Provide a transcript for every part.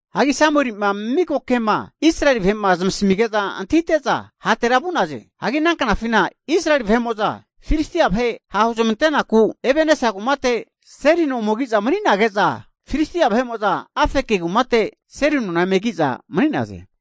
Hagi Samuelima miko ke'ma Israeli vahe'ma zmasamige'za antahite'za hatera vu'naze. Hagi ana knafina Israeli vahe'mo'za Filistia vahe ha' huzmante'naku Ebenesa kumate seli no ome ki'za mani'nage'za, Filistia vahe'mo'za Afeki kumate seli nona eme ki'za mani'naze.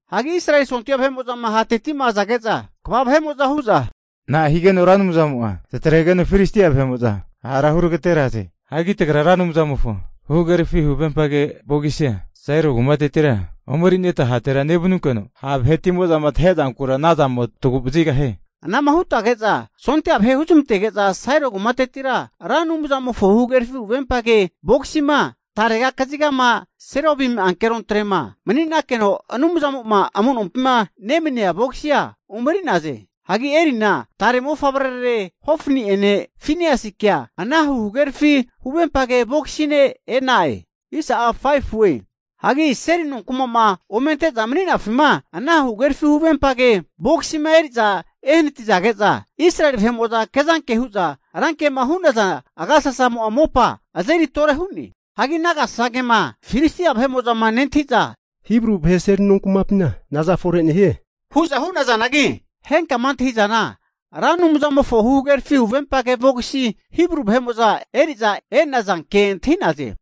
Hagi Israeli sondia vahe'mo'zama ha'tetima azage'za kva vahe'mo'za hu'za, na'a higeno Ra Anumzamo'a tatregeno Filistia vahe'mo'za hara hutagateraze? Hagi tagra Ra Anumzamofo huhagerafi huvempage vogisia Sailo kumatetira omerineta hatera nevanunkeno, ha' vahetimo'za tahe'zankura ana zamo tagu'vazigahie. Anagema hute'za sondia vahe huzmantage'za Sailo kumatetira Ra Anumzamofo huhagerafi huvempage vogisima tarega kazigama Serobimi ankerontrema mani'nakeno Anumzamo'ma amu'nompima nemania vogisia ome eri'naze. Hagi Elina tare mofavrearare Hofani'ene Finiasikea ana hugagerafi huvempage bogisine e'na'e. Hagi seli nonkuma'ma ome ante'za mani'nafima ana huhagerafi huvempage vogisima eri'za ehanatizage'za, Israeli vahe'mo'za kezanke hu'za rankema hu'naza agasasamo'a mopa azeri tore hu'ne. Hagi ana agasankema Filistia vahe'mo'zama nentahi'za, Hibru vahe seli nonkumapina naza fore nehie, hu'za hu'nazanagi henkama antahi'zana Ra Anumzamofo huhagerafi huvempage vogisi Hibru vahe'mo'za eri'za e'nazanke antahi'naze.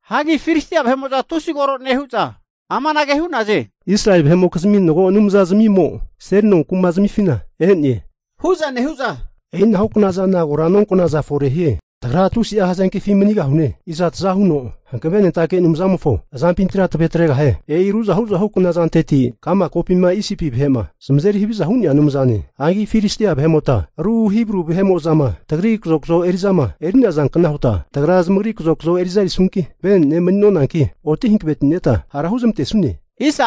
Hagi Filistia vahe'mo'za tusi koro nehu'za amanage hu'naze, Israeli vahe'mokizmi mago anumzazamimo seli nonkuma zamifina e'ne, hu'za nehu'za e'inahukna zana kora nonkonaza forehie. Tagra tusi'a hazenkefi manigahu'ne, iza taza huno hankavenentake anumzazmimofo azampintira tavretregahie? E'i ruzahu ruzahu knazanteti ka'ma kopima Isipi vahe'ma zamazeri haviza hu'nea anumzane. Hagi Filistia vahe'mota ru Hibru vahe'mo'zama tagri kazokzo eri'zama eri'nazankna huta, tagra zamagri kazokzo eri'za erisunki, vene'ne mani'nonanki oti hanaveti'neta hara huzmantesune.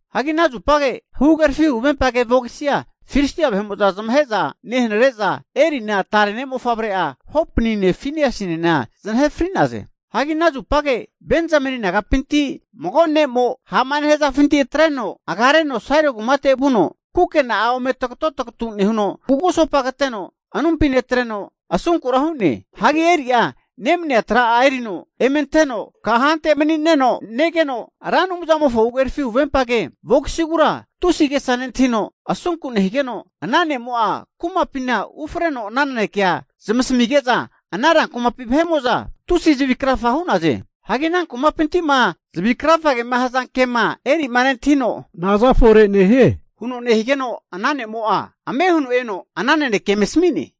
Hagi ana zupage huhagerafi huvempage vogisia Filistia vahe'mo'za zamahe'za nehanre'za, Elina tare ne' mofavre'ararena Hopnine Finiasinena zanahe fri'naze. Hagi ana zupage Benzameni nagapinti mago ne'mo ha'ma nehazafinti atreno agareno Sailo kumate vuno kukena'a ome tagoto tagatu nehuno, kugusopa kateno anumpi netreno, asunkura hu'ne. Hagi Eli'a nemania tra'a erino eme anteno kante mani'neno negeno, Ra Anumzamofo huhagerafi huvempage vogisigura tusi agesa nentahino asunku nehigeno, ana ne'mo'a kumapina ufreno ana nanekea zamasamige'za ana rankumapi vahe'mo'za tusi zavi krafa hu'naze. Hagi ana kumapinti'ma zavi krafagema hazanke'ma Eli'ma nentahino, nazafore nehie? Huno nehigeno ana ne'mo'a ame huno eno ana nanekea eme asami'ne.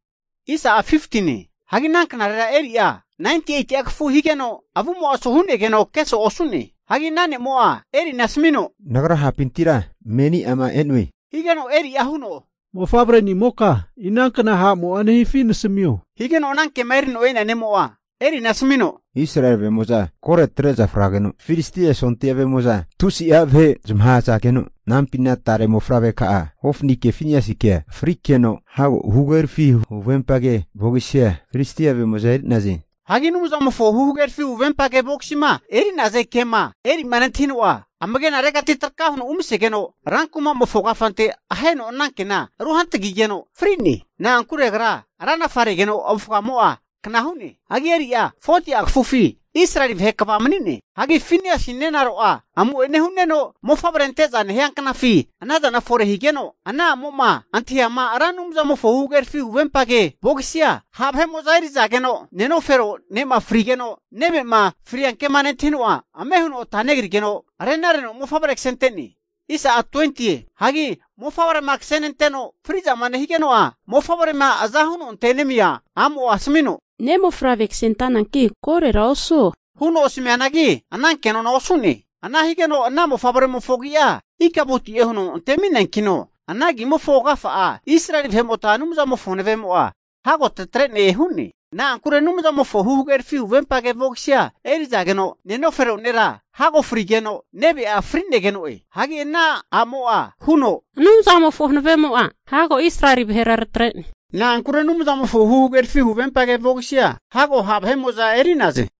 Hagi ana knarera Eli'a 98'a kafu higeno, avumo'a asu hu'negeno keso'e osu'ne. Hagi ana ne'mo'a Elina asamino, Nagra ha'pintira meni ama e'noe, higeno Eli'a huno, mofavrenimoka inankna ha'mo'a nehifi nasamio? Higeno ana kema erino e'nea ne'mo'a Elina asamino, Israeli vahe'mo'za kore atre'za frageno, Filistia sondia vahe'mo'za tusia vahe zamahazageno, anampina tare ne' mofavreka'ararena Hopnike Finiasikea frikeno, hago huhagerafi huvempage vogisia Filistia vahe'mo'za eri'naze. Hagi Anumzamofo huhagerafi huvempage vogisima eri'naze ke'ma Eli'a nentahino'a amagenaregati traka huno umasegeno, rankumamofo kafante aheno ananke rehantagigeno fri'ne. Na'ankure agra ranafaregeno avufamo'a kna hu'ne. Hagi Eli'a 40'a kafufi Israeli vahe kva mani'ne. Hagi Finiasi nenaro'a amu'ene hu'neno mofavre ante'za nehia knafi anazana fore higeno, ana a'mo'ma antahiama Ra Anumzamofo huhagerafi huvempage vogisi'a ha' vahe'mo'za erizageno, nenofero ne'ma frigeno, neve'ma fria kema nentahino'a ame huno ata negrigeno renareno mofavrea kasente'ne. Hagi mofavrema kasenenteno fri'zama nehigeno'a, mofavrema azahuno antenemia a'mo'a asamino, ne' mofavre kasentananki korora osuo, huno asamianagi, ana kenona'a osu'ne. Ana higeno ana mofavremofo agi'a Ikabotie huno antemineankino, ana agimofo agafa'a Israeli vahe'mota Anumzamofo hanavemo'a hago tatre'ne hu'ne. Na'ankure Anumzamofo huhagerafi huvempage vogisia erizageno, nenanofero nera hago fri'geno neve'enena fri'negeno'e. Hagi ana amo'a huno, Anumzamofo hanavemo'a hago Israeli vahera tatre'ne. Na'ankure Anumzamofo huhagerafi huvempage vogisia hago ha' vahe'mo'za eri'naze.